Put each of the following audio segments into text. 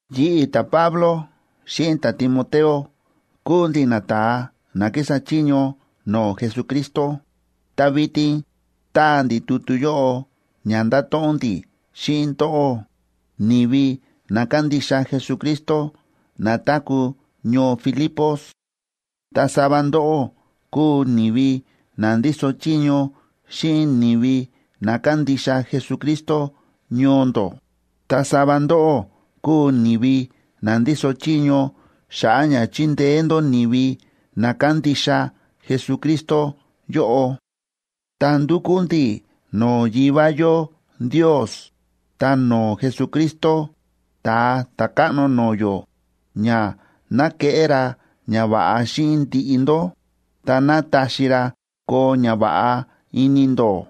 Yi̱ꞌi̱, ta̱Pablo, xíꞌin ta̱Timoteo, kúu ndi̱ nata̱a na kísa chiño no̱o̱ Jesucristo, ta vitin táa ndi̱ tutu yóꞌo ña ndato̱ꞌon ndi̱ xíꞌin ndóꞌó, ni̱vi na kándixa Jesucristo, na táku̱ ñoo Filipos. Ta sava ndóꞌó kúu ni̱vi na ndíso chiño xíꞌin ni̱vi na kándixa Jesucristo ñoo ndó, ta sava ndóꞌó kúu ni̱vi na ndíso chiño xa̱ꞌa̱ ña chindeé ndó ni̱vi na kándixa Jesucristo yóꞌo. Ta ndúkú ndi̱ no̱o̱ Yivá yó Ndios ta no̱o̱ Jesucristo, Ta̱a Ta̱káꞌno no̱o̱ yó, ña ná keꞌé ra ñava̱ꞌa xíꞌin ndiꞌi ndó, ta ná taxi ra koo ñava̱ꞌa ini ndó.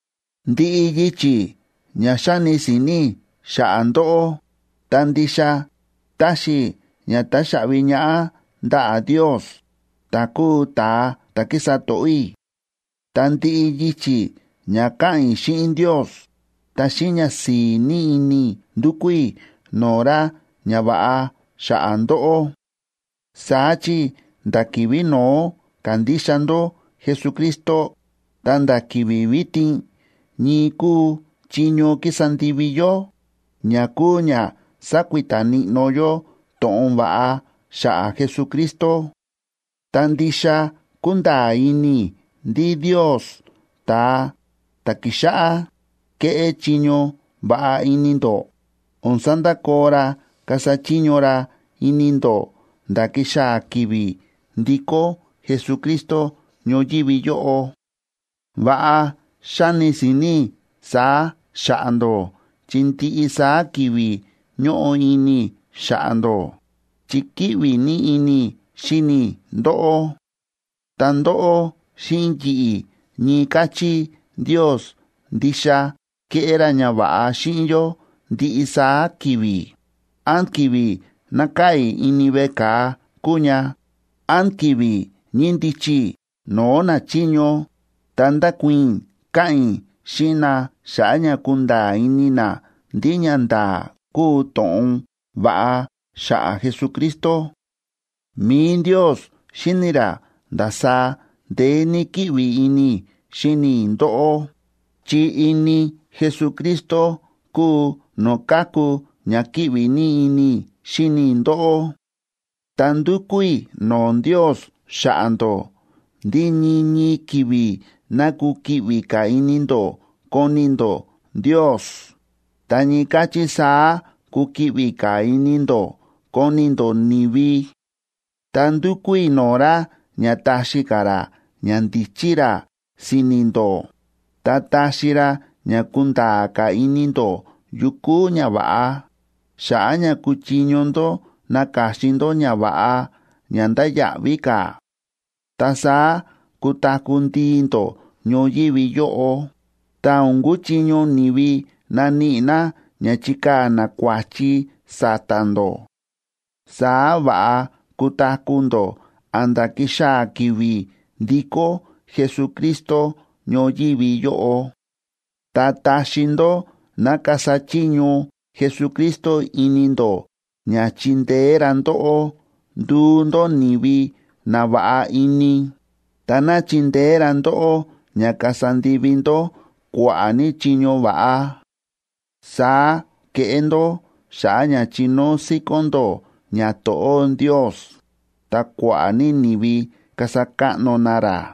Ndiꞌi yichi̱ ña xáni si̱ni̱ i̱ xa̱ꞌa̱ ndóꞌó, ta ndixa táxi i̱ ña taxaꞌvi ñaꞌá ndaꞌa̱ Ndios, ta̱ kúu ta̱a ta̱ kísa to̱ꞌó i̱. Ta ndiꞌi yichi̱ ña káꞌa̱n i̱ xíꞌin Ndios, ta xíꞌin ñasi̱i̱ ní ini i̱ ndúkú i̱ no̱o̱ ra ñava̱ꞌa xa̱ꞌa̱ ndóꞌó. Saá chi nda̱ ki̱vi̱ no̱ó ka̱ndixa ndó Jesucristo ta̱nda̱ ki̱vi̱ vitin, ñii kúu chiño kísa ndivi yó, ña kúu ña sákuita níꞌnó yó to̱ꞌon va̱ꞌa xa̱ꞌa̱ Jesucristo. Ta ndixa kúnda̱a̱ ini i̱ ndí Ndios, ta̱a ta̱ ki̱xáꞌá kéꞌé chiño va̱ꞌa ini ndó, o̱n sandakoo ra kasa chiño ra ini ndó nda̱ kixaa̱ ki̱vi̱ ndikó Jesucristo ñoyívi yóꞌo. Va̱ꞌa xáni si̱ni̱ i̱ saá xa̱ꞌa̱ ndó chi ndiꞌi saá ki̱vi̱ ñóꞌo ini i̱ xa̱ꞌa̱ ndó, chi kíꞌvi ní ini i̱ xíni i̱ ndóꞌó. Ta ndóꞌó xíꞌin yi̱ꞌi̱, ñii káchí Ndios ndixa kéꞌé ra ñava̱ꞌa xíꞌin yó ndiꞌi saá ki̱vi̱, án ki̱vi̱ nákaa̱ i̱ ini veꞌe ka̱a kúu ña, án ki̱vi̱ ñíndichi i̱ no̱o̱ nachiño ta ndákuii̱n i̱ káꞌa̱n i̱ xíꞌin na xa̱ꞌa̱ ña kunda̱a̱ ini na ndí ñanda̱a̱ kúu to̱ꞌon va̱ꞌa xa̱ꞌa̱ Jesucristo. Mi̱i Ndios xíni̱ ra ndasaá ndeé ní kíꞌvi ini i̱ xíni i̱ ndóꞌó, chi ini Jesucristo kúu no̱o̱ káku ña kíꞌvi ní ini i̱ xíni i̱ ndóꞌó. Ta ndúkú i̱ no̱o̱ Ndios xa̱ꞌa̱ ndó ndí ñii ñii ki̱vi̱ ná kukiꞌvi ka̱ ini ndó koni ndó Ndios, ta ñii káchí saá kukiꞌvi ka̱ ini ndó koni ndó ni̱vi. Ta ndúkú i̱ no̱o̱ ra ña taxi ka̱ ra ñandíchí ra si̱ni̱ ndó, ta taxi ra ña kunda̱a̱ ka̱ ini ndó yu kúu ñava̱ꞌa, xa̱ꞌa̱ ña kuchiño ndó naka̱xin ndó ñava̱ꞌa ña ndáya̱ꞌví ka̱. Ta saá kutaku̱ ndii ndó ñoyívi yóꞌo, ta o̱n kuchiño ni̱vi naníꞌi na ña chikaa̱ na kua̱chi sa̱ta̱ ndó. Saá va̱ꞌa kutaku̱ ndó a̱nda̱ kixaa̱ ki̱vi̱ ndikó Jesucristo ñoyívi yóꞌo. Ta taxi ndó ná kasa chiño Jesucristo ini ndó ña chindeé ra ndóꞌó nduu ndó ni̱vi na va̱ꞌa ini, ta ná chindeé ra ndóꞌó ña kasa ndivi ndó kua̱ꞌa̱ ní chiño va̱ꞌa. Saá keꞌé ndó xa̱ꞌa̱ ña chinóo síkón ndó ñato̱ꞌó Ndios, ta kua̱ꞌa̱ ní ni̱vi kasa káꞌno na ra.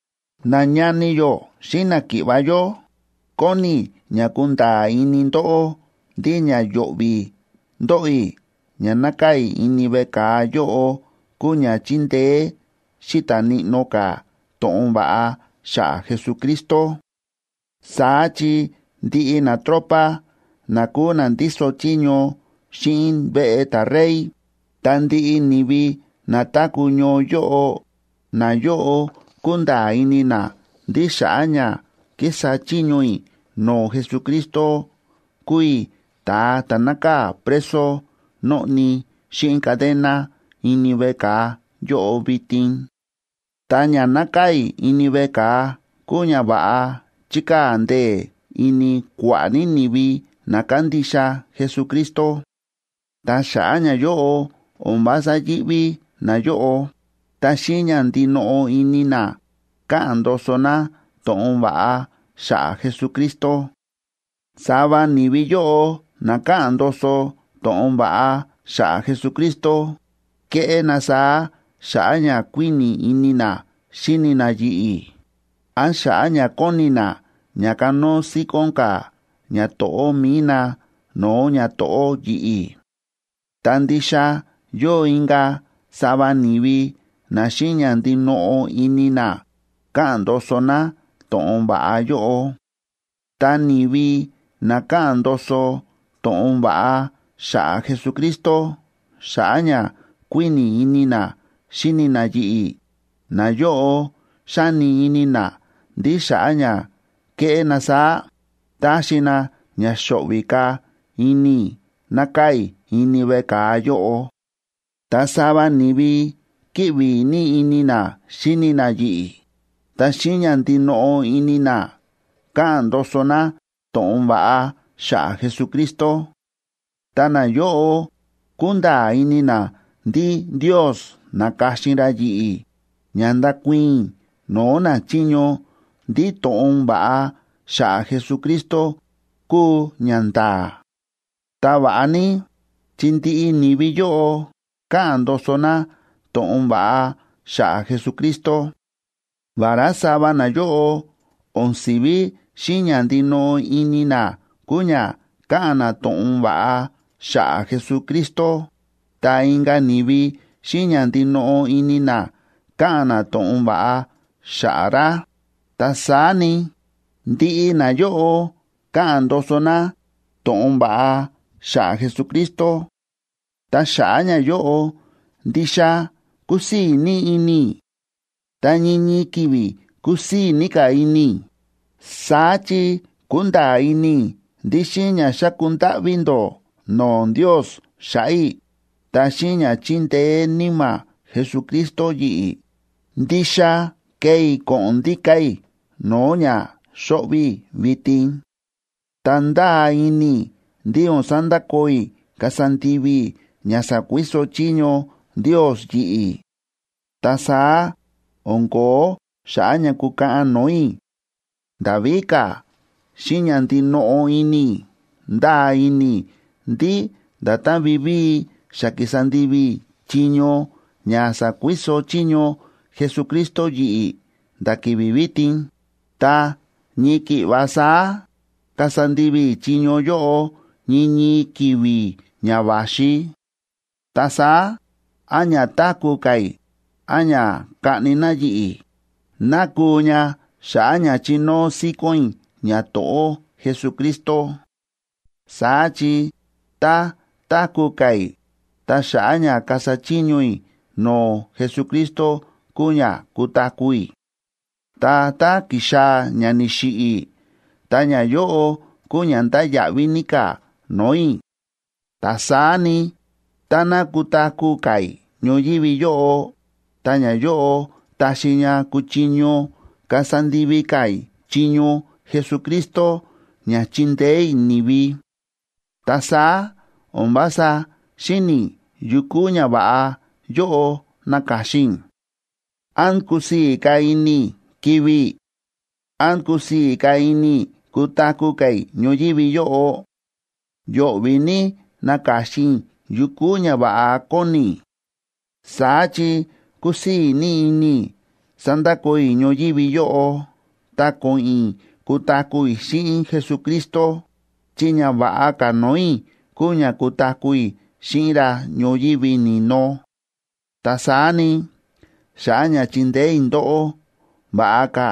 Nañani yó xíꞌin náki̱ꞌva̱ yó, kóni i̱ ña kunda̱a̱ ini ndóꞌó ndí ña yo̱ꞌvi̱ ndóꞌo i̱ ña nákaa̱ i̱ ini veꞌe ka̱a yóꞌo kúu ña chíndeé xíta̱ níꞌnó ka̱ to̱ꞌon va̱ꞌa xa̱ꞌa̱ Jesucristo. Saá chi ndiꞌi natropa na kúu na ndíso chiño xíꞌin veꞌe ta̱rey, ta ndiꞌi ni̱vi na táku̱ ñoo yóꞌo, nayóꞌo kúnda̱a̱ ini na ndí xa̱ꞌa̱ ña kísa chiño i̱ no̱o̱ Jesucristo kúu i̱ ta̱a ta̱ nákaa̱ preso nóꞌni xíꞌin cadena ini veꞌe ka̱a yóꞌo vitin. Ta ña nákaa̱ i̱ ini veꞌe ka̱a kúu ñava̱ꞌa chíkaa̱ ndee̱ ini kua̱ꞌa̱ ní ni̱vi na kándixa Jesucristo. Ta xa̱ꞌa̱ ñayóꞌo, o̱n vása yíꞌví nayóꞌo, ta xíꞌin ña ndinoꞌo ini na káꞌa̱n ndoso na to̱ꞌon va̱ꞌa xa̱ꞌa̱ Jesucristo. Sava ni̱vi yóꞌo na káꞌa̱n ndoso to̱ꞌon va̱ꞌa xa̱ꞌa̱ Jesucristo, kéꞌé na saá xa̱ꞌa̱ ña kuíni̱ ini na xíni na yi̱ꞌi̱, án xa̱ꞌa̱ ña kóni na ña kanóo síkón ka̱ ñato̱ꞌó mi̱i na no̱o̱ ñato̱ꞌó yi̱ꞌi̱. Ta ndixa yóo inka̱ sava ni̱vi na xíꞌin ña ndinoꞌo ini na káꞌa̱n ndoso na to̱ꞌon va̱ꞌa yóꞌo. Ta ni̱vi na káꞌa̱n ndoso to̱ꞌon va̱ꞌa xa̱ꞌa̱ Jesucristo xa̱ꞌa̱ ña kuíni̱ ini na xíni na yi̱ꞌi̱, nayóꞌo xáni ini na ndí xa̱ꞌa̱ ña kéꞌé na saá, táxi na ña xo̱ꞌvi̱ ka̱ ini i̱ nákaa̱ i̱ ini veꞌe ka̱a yóꞌo. Ta sava ni̱vi kíꞌvi ní ini na xíni na yi̱ꞌi̱, ta xíꞌin ña ndinoꞌo ini na káꞌa̱n ndoso na to̱ꞌon va̱ꞌa xa̱ꞌa̱ Jesucristo. Ta nayóꞌo kúnda̱a̱ ini na ndí Ndios na̱ka̱xin ra yi̱ꞌi̱ ña ndakuii̱n i̱ no̱o̱ nachiño ndí to̱ꞌon va̱ꞌa xa̱ꞌa̱ Jesucristo kúu ñanda̱a̱. Ta va̱ꞌa ní, chi ndiꞌi ni̱vi yóꞌo káꞌa̱n ndoso na to̱ꞌon va̱ꞌa xa̱ꞌa̱ Jesucristo. Vará sava nayóꞌo o̱n si̱ví xíꞌin ña ndinoꞌo ini na kúu ña káꞌa̱n na to̱ꞌon va̱ꞌa xa̱ꞌa̱ Jesucristo, ta inka̱ ni̱vi xíꞌin ña ndinoꞌo ini na káꞌa̱n na to̱ꞌon va̱ꞌa xa̱ꞌa̱ ra, ta saá ni, ndiꞌi nayóꞌo káꞌa̱n ndoso na to̱ꞌon va̱ꞌa xa̱ꞌa̱ Jesucristo. Ta xa̱ꞌa̱ ñayóꞌo, ndixa kúsii̱ ní ini i̱, ta ñii ñii ki̱vi̱ kusii̱ ní ka̱ ini i̱. Saá chi kúnda̱a̱ ini i̱ ndí xíꞌin ña xáku ndáꞌví ndó no̱o̱ Ndios xa̱ꞌa̱ i̱, ta xíꞌin ña chíndeé Níma̱ Jesucristo yi̱ꞌi̱, ndixa kee i̱ ko̱ꞌo̱n ndíka̱ i̱ no̱o̱ ña xóꞌvi̱ i̱ vitin. Ta ndáa ini i̱ ndí o̱n sandakoo i̱ kasa ndivi i̱ ña sa̱kuiso chiño Ndios yi̱ꞌi̱. Ta saá o̱n ko̱ó xa̱ꞌa̱ ña kukaꞌan no̱o̱ i̱. Nda̱ víka̱, xíꞌin ña ndinoꞌo ini i̱, ndáa ini i̱ ndí nda̱tán vivíi xa ki̱sa ndivi i̱ chiño ña sa̱kuiso chiño Jesucristo yi̱ꞌi̱ nda̱ ki̱vi̱ vitin, ta ñii ki̱ꞌva saá kasa ndivi i̱ chiño yóꞌo ñii ñii ki̱vi̱ ña va̱xi. Ta saá, án ña táku̱ ka̱ i̱, án ña kaꞌni na yi̱ꞌi̱, ná kuu ña xa̱ꞌa̱ ña chinóo síkón i̱ ñato̱ꞌó Jesucristo. Saá chi tá táku̱ ka̱ i̱, ta xa̱ꞌa̱ ña kasa chiño i̱ no̱o̱ Jesucristo kúu ña kutaku̱ i̱. Ta tá kixaa̱ ña ni̱xiꞌi̱ i̱, ta ñayóꞌo kuu ña ndáya̱ꞌví ní ka̱ no̱o̱ i̱. Ta saá ni, táná kutaku̱ ka̱ i̱ ñoyívi yóꞌo, ta ñayóꞌo taxi ña kuchiño kasa ndivi ka̱ i̱ chiño Jesucristo ña chindeé i̱ ni̱vi. Ta saá o̱n vása xíni̱ i̱ yukú ñava̱ꞌa yóꞌo naka̱xin i̱. ¿Án kusii̱ ka̱ ini i̱ kivi̱ i̱? ¿Án kusii̱ ka̱ ini i̱ kutaku̱ ka̱ i̱ ñoyívi yóꞌo? Yo̱ꞌvi̱ ní naka̱xin i̱ yukú ñava̱ꞌa kóni i̱. Saá chi kúsii̱ ní ini i̱ sandakoo i̱ ñoyívi yóꞌo, ta ko̱ꞌo̱n i̱ kutaku̱ i̱ xíꞌin Jesucristo, chi ña va̱ꞌa ka̱ no̱o̱ i̱ kúu ña kutaku̱ i̱ xíꞌin ra ñoyívi ni̱no. Ta saá ni, xa̱ꞌa̱ ña chindeé i̱ ndóꞌó, va̱ꞌa ka̱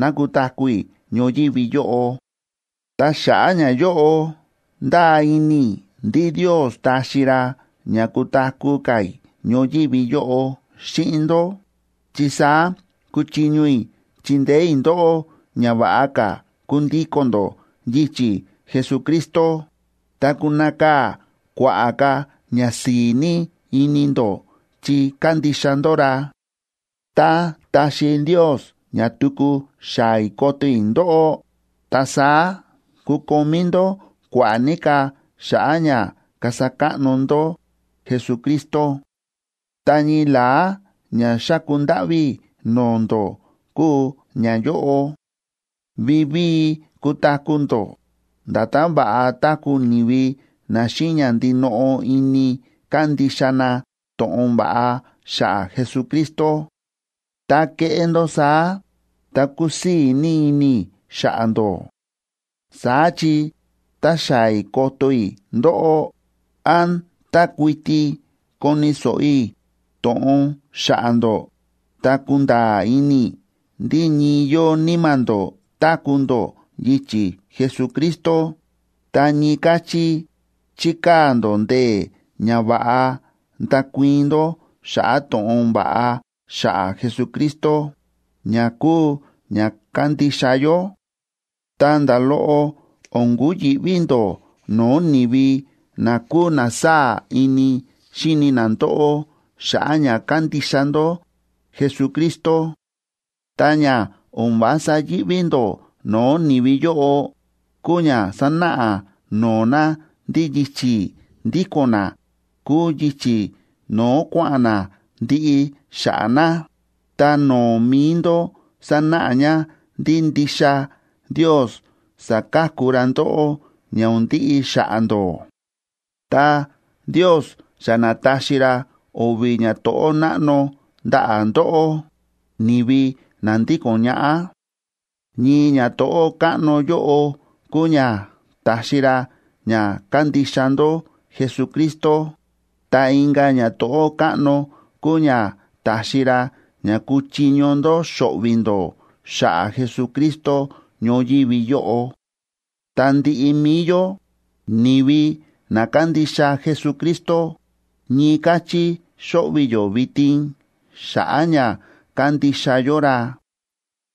ná kutaku̱ i̱ ñoyívi yóꞌo. Ta xa̱ꞌa̱ ñayóꞌo, ndáa ini i̱ ndí Ndios taxi ra ña kutaku̱ ka̱ i̱ ñoyívi yóꞌo xíꞌin ndó, chi saá kuchiño i̱ chindeé i̱ ndóꞌó ña va̱ꞌa ka̱ kundíko̱n ndó yichi̱ Jesucristo, ta kunakaa̱ kua̱ꞌa̱ ka̱ ñasi̱i̱ ní ini ndó chi kándixa ndó ra. Tá taxi Ndios ña tuku xaa̱ i̱ koto i̱ ndóꞌó, ta saá kukomí ndó kua̱ꞌa̱ ní ka̱ xa̱ꞌa̱ ña kasa káꞌno ndó Jesucristo. Ta ñii la̱á ña xáku ndáꞌví i̱ no̱o̱ ndó kúu ñayóꞌo: Vivíi kutaku̱ ndó nda̱tán va̱ꞌa táku̱ ni̱vi na xíꞌin ña ndinoꞌo ini kándixa na to̱ꞌon va̱ꞌa xa̱ꞌa̱ Jesucristo. Tá keꞌé ndó saá, ta kusii̱ ní ini i̱ xa̱ꞌa̱ ndó. Saá chi, tá xaa̱ i̱ koto i̱ ndóꞌó, án tá kuiti koni̱ so̱ꞌo i̱ to̱ꞌon xa̱ꞌa̱ ndó, ta kunda̱a̱ ini i̱ ndí ñii yóo níma̱ ndó táku̱ ndó yichi̱ Jesucristo, ta ñii káchí chíkaa̱ ndó ndee̱ ña va̱ꞌa ndakuii̱n ndó xa̱ꞌa̱ to̱ꞌon va̱ꞌa xa̱ꞌa̱ Jesucristo ña kúu ña kándixa yó. Ta nda̱ loꞌo o̱n kuyi̱ꞌví ndó no̱o̱ ni̱vi na kúu na sáa̱ ini xíni na ndóꞌó xa̱ꞌa̱ ña kándixa ndó Jesucristo. Ta ña o̱n vása yíꞌví ndó no̱o̱ ni̱vi yóꞌo, kúu ña sánáꞌa no̱o̱ na ndí yichi̱ ndíko̱n na kúu yichi̱ no̱o̱ kua̱ꞌa̱n na ndiꞌi xa̱ꞌa̱ na, ta no̱o̱ mi̱i ndó sánáꞌa ña ndí ndixa Ndios saka̱ku ra ndóꞌó ña o̱n ndiꞌi xa̱ꞌa̱ ndó. Ta Ndios xa na̱taxi ra o̱vi̱ ñato̱ꞌó náꞌno ndaꞌa̱ ndóꞌó, ni̱vi na ndíko̱n ñaꞌá. Ñii ñato̱ꞌó káꞌno yóꞌo kúu ña ta̱xi ra ña kándixa ndó Jesucristo, ta inka̱ ñato̱ꞌó káꞌno kúu ña ta̱xi ra ña kúchiño ndó xo̱ꞌvi̱ ndó xa̱ꞌa̱ Jesucristo ñoyívi yóꞌo. Ta ndiꞌi mi̱i yó, ni̱vi na kándixa Jesucristo, ñii káchí xóꞌvi̱ yó vitin xa̱ꞌa̱ ña kándixa yó ra.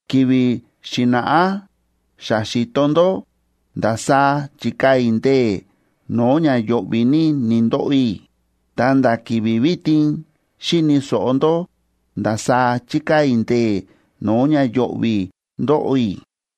Ki̱vi̱ xi̱na̱ꞌá xa xi̱to ndó ndasaá chi̱kaa̱ i̱ ndee̱ no̱o̱ ña yo̱ꞌvi̱ ní ni̱ndoꞌo i̱, ta̱nda̱ ki̱vi̱ vitin xíni̱ so̱ꞌo ndó ndasaá chíkaa̱ i̱ ndee̱ no̱o̱ ña yo̱ꞌvi̱ ndóꞌo i̱.